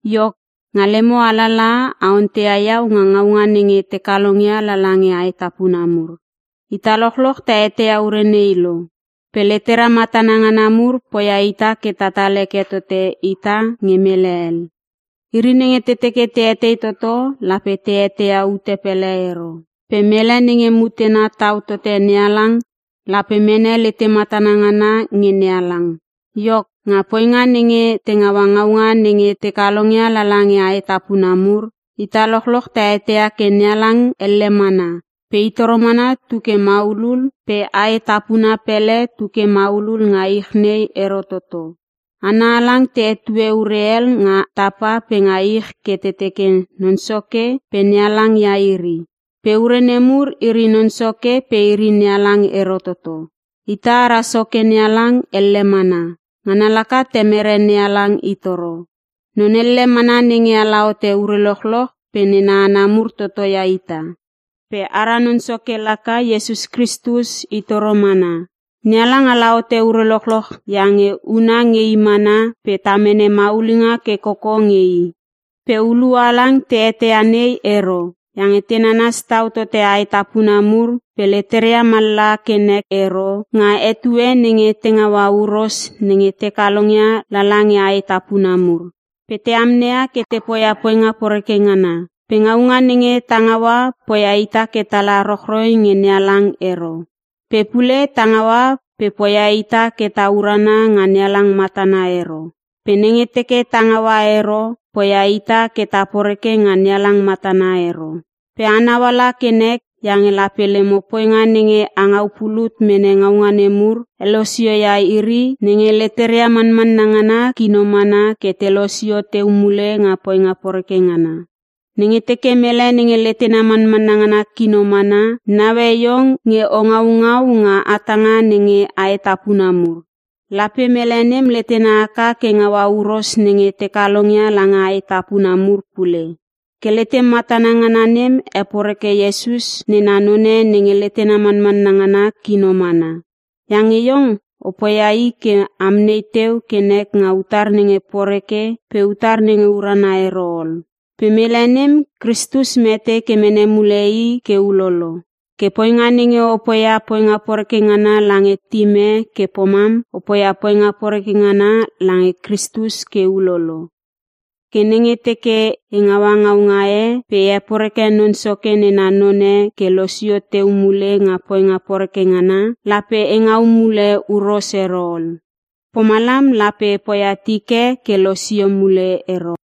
Iok, nga lemo alalaha a onteia iau nga ngaunga nenge te kalongia lala nge aetapuna mur. Ita lochloch ta eteia ure nei lo. Pe letera matana ngana mur poia ita ke tatal heke totote ita nge mele hel. Iri nenge te teke te etei toto lape te eteia ute pele ero. Pe mele nenge mutena tau tote NeHalang lape mene lete matana ngana nge NeHalang. Iok, nga poinga nenge te ngaua ngaunga nenge te kalongia lala nge aetapuna mur: Ita lochloch ta eteia ke NeHalang elle mana pe itoro mana tu ke maulul pe aetapuna pele tu ke maulul nga ich nei ero toto. Hana halang te hetue ure hel nga tapa pe nga ich ke te teke non soke pe nehalang ia iri. Pe ure nemur iri Non Soke pe iri NeHalang ero toto. Ita ara Soke NeHalang elle mana, ngana laka Temere NeHalang itoro. Non elle mana nenge ala hote ure lochloch pe nena hana mur toto ita. Pe ara Non Soke laka Iesus Kristus i toro mana. NeHalang ala hote ure lochloch iange huna nge I mana pe ta mene maulinga ke koko nge I. Pe hulua halang te eteia nei ero. Iange te nanas tau tote aetapuna mur pe leteria mallaha kenek ero nga etue nenge te ngaua huros nenge te kalongia lala nge aetapuna mur. Pe te amneia ke te poia poinga poreke ngana. Pe ngaunga nenge ta ngaua poia ita ke tala rochroi nge NeHalang ero. Pe pule ta ngaua pe poia ita ke ta urana nga NeHalang matana ero pe nenge teke ta ngaua ero poia ita ke ta poreke nga NeHalang matana ero. Pe a nauala ke nek iange lape lemo poinga nenge angau pulut mene ngaunga nemur, helosio ia iri nenge leteria manmanna ngana kino mana ke te losio teu mule nga poinga poreke ngana. Nenge teke mele nenge letena manmanna ngana kino mana, naue iong nge o ngaungau nga hatanga nenge aetapuna mur, lape mele nem letena haka ke ngaua huros nenge te kalongia lange aetapuna mur pule. Ke letem matana ngana nem heporeke Iesus nena none nenge letena manmanna ngana kino mana. Iange iong opoia i ke amnei teu ke nek nga utar nenge poreke pe utar nenge urana ero ol. Pe mele nem Kristus mete ke mene mule i ke ulolo. Ke poinga nenge o poia poinga poreke ngana lange tim e ke pomam, o poia poinga poreke ngana lange Kristus ke ulolo. Ke nenge teke e ngaua ngaunga e pe e heporeke Non Soke nena none ke losio teu mule nga poinga poreke ngana, lape e ngau mule huros ero ol. Pomalam lape e poia tik e ke losio mule ero.